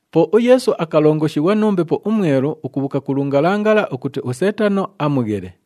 Po uYeesu akalongoshighwa nu Mbepo uMwelu ukubhuuka ku lungalangala ukuti uSeetano amughele.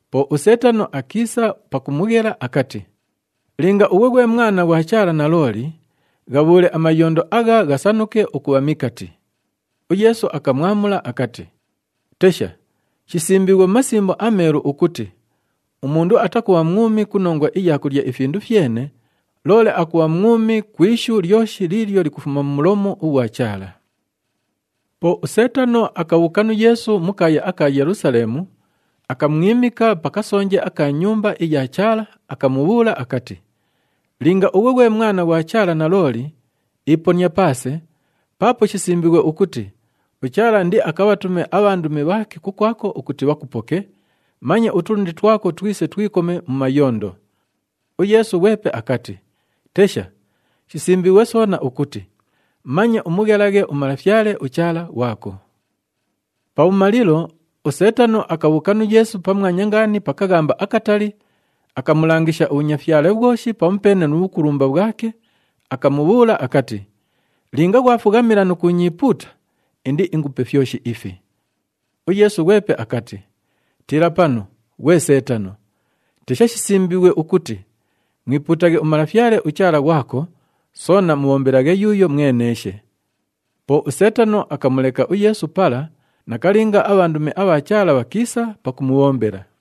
Po uSeetano akiisa pakumughela akati, “Linga ughwe ghwe Mwana ghwa Chaala nalooli, ghabhuule amayondo agha ghasanuke ukubha mikati.” UYeesu akamwamula akati, “Tesha, shisimbiighwe mu Masimbo aMeelu ukuti, ‘Umundu atakubha mwumi ku nongwa iya kulya ifindu fyene, loole akubha mwumi ku ishu lyoshi liilyo likufuma mu mulomu ughwa Chaala.’” Po uSeetano akabhuuka nu Yeesu mu kaaya aka Yelusaleemu, akamwimika pa kasonje aka Nyumba iya Chaala, akamubhuula akati, “Linga ughwe ghwe Mwana ghwa Chaala nalooli, iponia paase, paapo shisimbiighwe ukuti, ‘UChaala indiakabhatume abhandumi bhaake kukwako ukuti bhakupoke, manye utulundi twako twise twikome mu mayondo.’” UYeesu ghwepe akati, “Tesha, shisimbiighwe soona ukuti, ‘Manye umughelaghe uMalafyale, uChaala ghwako.’” Pabhumalilo, uSeetano akabhuuka nu Yeesu pamwanya ngaani pa kaghamba akatali, akamulangisha ubhunyafyale bhwoshi pamupeene nu bhukulumba bhwake, akamubhuula akati, “Linga ghwafughamila nu kuunyiipuuta, indiingupe fyoshi ifi.” UYeesu ghwepe akati, “Tiila panu, ghwe Seetano! Tesha, shisimbiighwe ukuti, ‘Mwipuutaghe uMalafyale uChaala ghwako, soona mubhombelaghe yuuyo mweneeshe.’” Po uSeetano akamuleka uYeesu pala, nakalinga abhandumi abha Chaala bhakiisa pakumubhombela.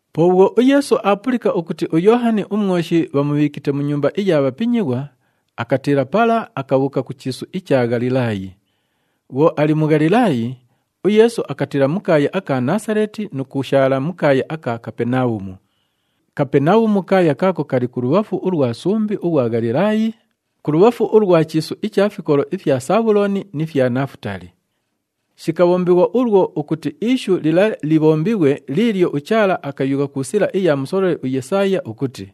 Po bhwo uYeesu aapulika ukuti uYoohani uMwoshi bhamubhiikite mu nyumba iya bhapinyighwa, akatiila pala, akabhuuka ku chiisu icha Ghalilaayi. Bhwo ali mu Ghalilaayi, uYeesu akatiila mu kaaya aka Naasaleeti nu kushaala mu kaaya aka Kapenabhumu. Kapenabhumu kaaya kaako kali kulubhafu ulwa sumbi ughwa Ghalilaayi, kulubhafu ulwa chiisu icha fikolo ifya Sabhulooni ni fya Nafutaali. Shikabhombighwa ulwo ukuti ishu lila libhombighwe liilyo uChaala akayugha ku sila iya musololi uYesaaya ukuti,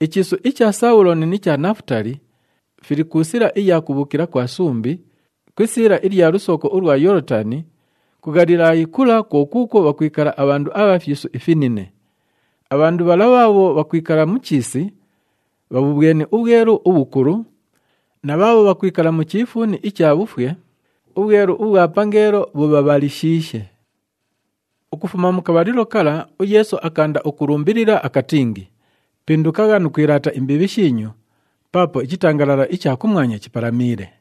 “Ichiisu icha Sabhulooni ni cha Nafutaali, fili ku sila iya kubhuukila kwa sumbi, ku isiila ilya lusooko ulwa Yoolotani, ku Ghalilaayi kula kwo kuukwo bhakwikala abhandu abha fyisu ifinine. Abhandu bhala bhaabho bhakwikala mu chiisi, bhabhubhweni ubhwelu ubhukulu, na bhaabho bhakwikala mu chiifuuni icha bhufwe, ubhwelu ubhwa pangeelo bhubhabhalishiishe.” Ukufuma mu kabhalilo kala, uYeesu akaanda ukulumbilila akatingi, “Pindukagha nu kwilaata imbiibhi shiinyu, paapo ichitangalala icha kumwanya chipalamiile.”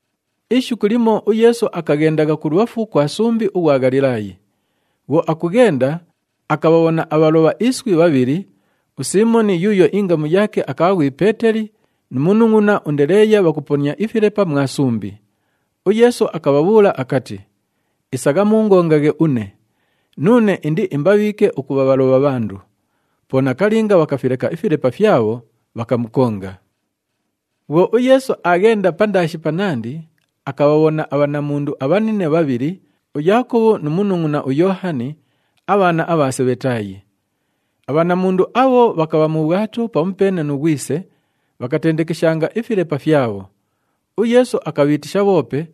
Ishiku limo uYeesu akaghendagha kulubhafu kwa sumbi ughwa Ghalilaayi. Bhwo akughenda, akabhabhona abhalobha iswi bhabhili, uSiimoni yuuyo ingamu yaake akabha ghwi Peeteli nu munungʼuna uNdeleeya bhakuponia ifilepa mwa sumbi. UYeesu akabhabhuula akati, “Isagha muungongaghe une! Nuune indiimbabhiike ukubha bhalobha bhandu.” Po nakalinga, bhakafileka ifilepa fyabho, bhakamukonga. Bhwo uYeesu aaghenda pandaashi panandi, akabhabhona abhanamundu abhanine bhabhili, uYaakobhu nu munungʼuna uYoohani, abhaana abha Sebhetaayi. Abhanamundu abho bhakabha mu bhwato pamupeene nu ghwise, bhakatendekeshanga ifilepa fyabho. UYeesu akabhiitisha bhoope,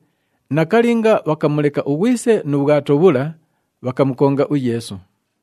nakalinga, bhakamuleka ughwise nu bhwato bhula, bhakamukonga uYeesu.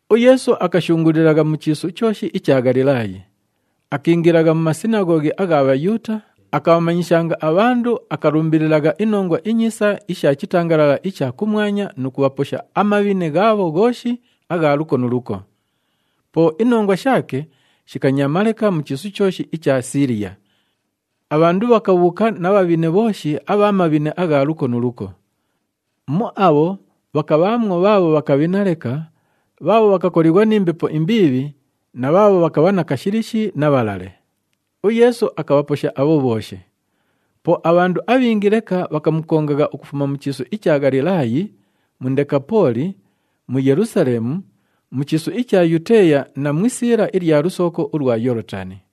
UYeesu akashunguulilagha mu chiisu chooshi icha Ghalilaayi. Akiingilagha mu masinaghoghi agha Bhayuuta, akabhamanyishanga abhandu, akalumbililagha iNongwa iNyiisa isha chitangalala icha kumwanya nu kubhaposha amabhine ghaabho ghooshi agha luko nu luko. Po inongwa shaake shikanyaama leka mu chiisu chooshi icha Siiliya. Abhandu bhakabhuuka na bhabhine bhooshi abha mabhine agha luko nu luko. Mu abho, bhakabhaamwo bhaabho bhakabhina leka, bhaabho bhakakolighwa ni mbepo imbiibhi na bhaabho bhakabha na kashilishi na bhalale. UYeesu akabhaposha abho bhooshi. Po abhandu abhingi leka bhakamukongagha ukufuma mu chiisu icha Ghalilaayi, mu Ndekapooli, mu Yelusaleemu, mu chiisu icha Yuteeya na mu isiila ilya lusooko ulwa Yoolotani.